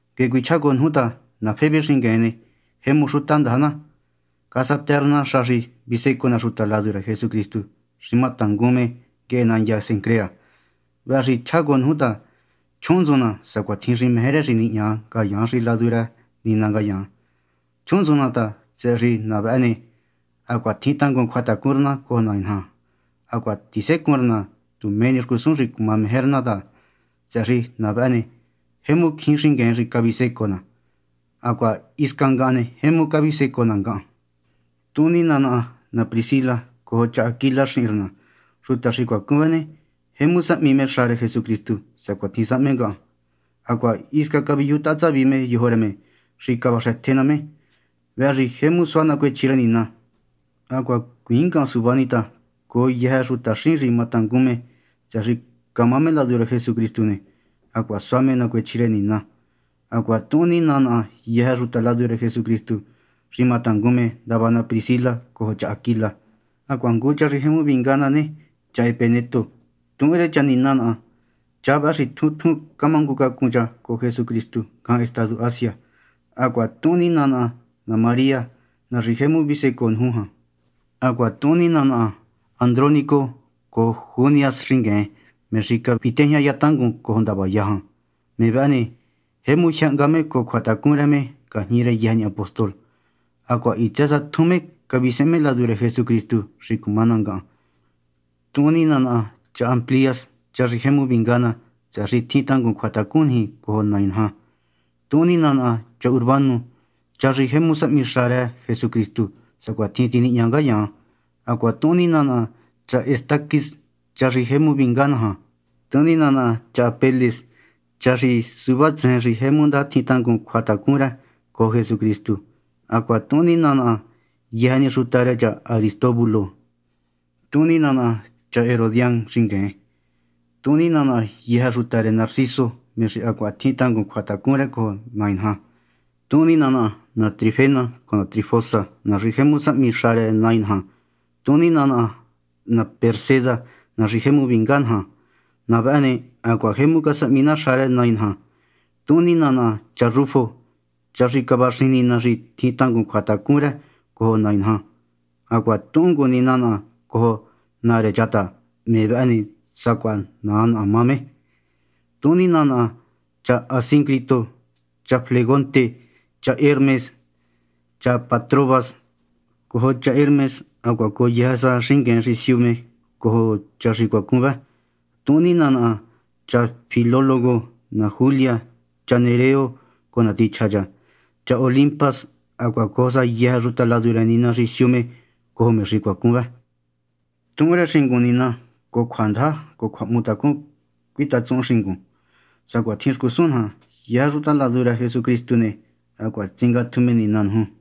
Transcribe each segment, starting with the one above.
Nguehe cuichjá cojo nuju ta na Febe xingueen ne, jemu xuta ndaja na. Casatë rë na xa xi visecoo na xuta ladu rë Jesucristu xi ma tangun me nguehe nandya Cencrea. Vëhë xi chjá cojo nuju ta, chjuhunntsun na sacuatjin xi meje rë xi nihña ngayaan xi ladu rë Nina ngayaan. Chjuhunntsun na ta, tsëhë xi na vëhë ne, hacuaha tjin tangun cjuatacun rë na cojo Nai naja. Hacuaha tisecun rë na tu mé ni xcusun xi cuma meje rë na ta, tsëhë xi na vëhë ne, jemu cjín xingueen xi cavisecoo na. Hacuaha hisca ngahan ne, jemu cavisecoo na ngahan. Tuhun nina naha na Priscila cojo cha Aquila xihin rë na. Xuta xi cuacun vë ne, jemu sahmi me xa rë Jesucristu sacuatjin sahme ngahan, hacuaha hisca caviyujutaha tsavi me yojo rë me xi cavaxëtje ná me. Vëhë xi jemu suá nacuechji rë Nina. Hacuaha hacuiin ngahan suva ni ta cojo yëjë xutaxín xi matangun me tsëhë xi camá me ladu rë Jesucristu ne, hacuaha sua me nacuechji rë Nina. Hacuaha tuhun nina naha yëjë xuta ladu rë Jesucristu xi matangun me ndava na Priscila cojo cha Aquila. Hacuaha ngu cha xi jemu vinga ná ne, cha Epeneto ne, tuhun rë cha nina naha. Cha vëhë xi tjun tjun camangucacun cha cojo Jesucristu ngajan estadu Asia. Hacuaha tuhun nina naha na María, na xi jemu cavisecoo nuju jan. Hacuaha tuhun nina naha Andrónico cojo Junias xingueen, me xi cavitejñaya tangun cojo ndavaya jan. Me vëhë ne, jemu jyë hnga me cojo cjuatacun rë me ngajñi rë yëjë ni apóstol, hacuaha hitsë sa tjun me cavisehen me ladu rë Jesucristu xi cuma ná ngahan. Tuhun nina naha cha Amplias, cha xi jemu vinga ná, tsëhë xi tjin tangun cjuatacun niji cojo Nai naja. Tuhun nina naha cha Urbano, cha xi jemu sahmi xa rë Jesucristu sacuatjin tinihña ngayaan. Hacuaha tuhun nina naha cha Estaquis, cha xi jemu vinga ná jan. Tuhun nina naha cha Apeles, cha xi suvá tsejen xi jemu ndaja tjin tangun cjuatacun rë cojo Jesucristu. Hacuaha tuhun nina naha yëjë ni xuta rë cha Aristóbulo. Tuhun nina naha cha Herodián xingueen. Tuhun nina naha yëjë xuta rë Narciso, me xi hacuaha tjin tangun cjuatacun rë cojo Nai naja. Tuhun nina naha na Trifena cojo na Trifosa, na xi jemu sahmi xa rë Nai naja. Tuhun nina naha na Pérsida, na xi jemu vinga naja jan. Na vëhë ne, hacuaha jemu casahmi na xa rë Nai naja. Tuhun nina naha cha Rufo, cha xi cavaxijin Nina xi tjin tangun cjuatacun rë cojo Nai naja. Hacuaha tuhun ngu nina naha cojo naa rë cha ta, me vëhë ne, sacuaha naa naha me. Tuhun nina naha cha Asíncrito, cha Flegonte, cha Hermas, cha Patrobas, cha Hermes, hacuaha cojo sa yëjë xingueen xi siu me cojo cha xi cuacun vë. Tuhun nina naha cha Filólogo, na Julia, cha Nereo cojo na tichja cha, cha Olimpas, hacuaha cojo sa yëjë xuta ladu rë Nina xi siu me cojo me xi cuacun vë. Tuhun rë xingun nina, cojo cjuandaja cojo cjuahmutacun cuitatsuhun xingun, sacuatjin xcusun naja. Yëjë xuta ladu rë Jesucristu ne, hacuaha tsingatju me nina nuju.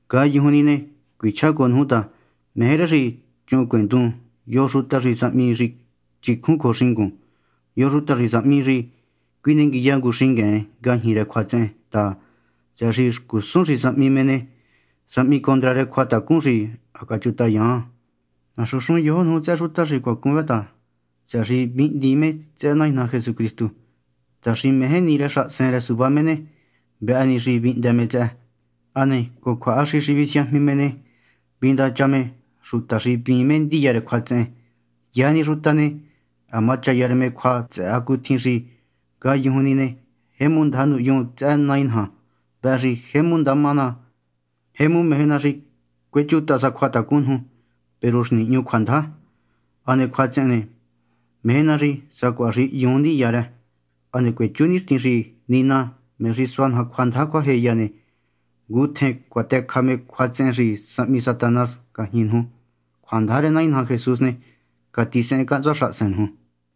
Ngayujun ni ne, cuichjá cojo nuju ta meje rë xi chuhuncuendun yo xuta xi sahmi xi chicjun cojo xingun, yo xuta xi sahmi xi cjuinenguiya ngu xingueen ngajñi rë cjuatsehen ta, tsëhë xi xcusun xi sahmi me ne, sahmi condra rë cjuachacun xi ha cachutayun. Naxunxun yojo nuju tsëhë xuta xi cuacun vë ta, tsëhë xi vihndiin me tsëhë Nai naja Jesucristu ta xi meje ni rë xahasen rë suvá me ne, vëhë ni xi vihndë me tsëhë. Hane cojo cjuahaxi xi visiajmi me ne, vindacha me xuta xi hvíin ndiya rë cjuatsehen. Yëjë ni xuta ne, ha machaya rë me cjua tsëhë hacutjin xi ngayujun ni ne, jemu ndaja nuhyun tsëhë Nai naja. Vëhë xi jemu ndama ná. Jemu meje ná xi cuechutaha sa cjuatacun nuju, peru xi nihñu cjuandaja. Hane cjuatsehen ne, meje ná xi sacuaha xi hyuun ndiya rë. Hane cuechú nixtin xi Nina, me xi sua naja cjuandaja cjuajeya ne, ngutjen cuatëcja me cjuatsehen xi sahmi Satanás ngajñi nuju. Cjuandaja rë Nai naja Jesús ne, catisehen cahntsua xahasen nuju.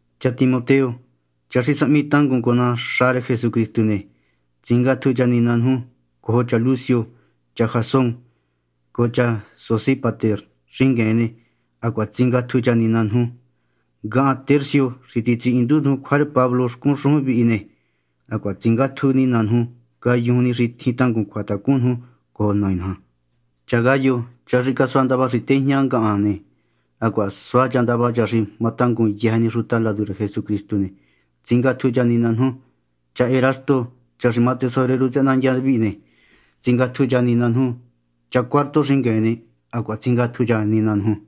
Cha Timoteo, cha xi sahmi tangun cojo ná xa rë Jesucristu ne, tsingatju cha nina nuju. Cojo cha Lucio, cha Jasón, cojo cha Sosípater xingueen ne, hacuaha tsingatju cha nina nuju. Ngahan, Tercio, xi titsihindu cjua rë Pablo xcun xujun vihi ne, hacuaha tsingátju nina nuju ngayujun ni xi tjin tangun cjuatacun nuju cojo Nai naja. Cha Gayo, cha xi casua ndava xi tejña ngahan ne, hacuaha sua cha ndava cha xi ma tangun yëjë ni xuta ladu rë Jesucristu ne, tsingatju cha nina nuju. Cha Erasto, cha xi má tesorero tsëhë nandya vihi ne, tsingatju cha nina nuju. Cha Cuarto xingueen ne, hacuaha tsingatju cha nina nuju.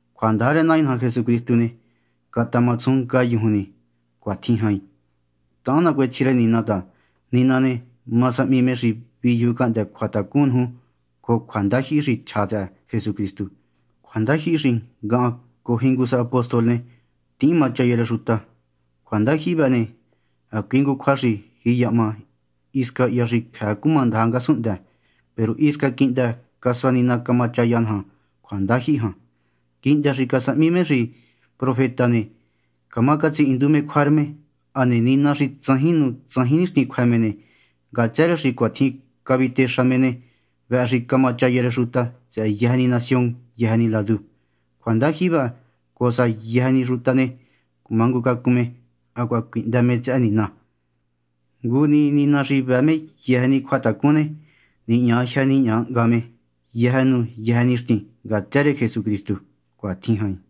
Cjuandaja rë Nai naja Jesucristu ne, catama tsujun ngayujun ni. Cuatjin jain. Tahan nacuechji rë Nina ta, Nina ne, ma sahmi me xi viyuju cahndë́ cjuatacun nuju cojo cjuandajyihi xi chja tsëhë Jesucristu, cjuandajyihi xi ngahan cojo jingu sa apóstol ne, tihín machaya rë xuta. Cjuandajyihi vëhë ne, hacui ngu cjua xi jiyahma hisca hya xi cjëë cumandaja ngasunhndë. Peru hisca quihndë casua Nina camachaya naja cjuandajyihi jan, quihndë xi casahmi me xi profeta ne, camá catsihindu cjua rë me. Hane Nina xi tsajin nu tsajin nixtin cjuë me ne, ngatsë rë xi cuatjin cavitexa me ne, vëhë xi camachaya rë xuta tsëhë yëjë ni nación yëjë ni ladu cjuandajyihi vëhë, cojo sa xi yëjë ni xuta ne, cumangucacun me hacuaha cuihndë me tsëhë Nina. Ngu ni Nina xi vëë yëjë ni cjuatacun ne, nihña jyë nihña hnga me yëjë nu yëjë nixtin ngatsë rë Jesucristu. Cuatjin jain.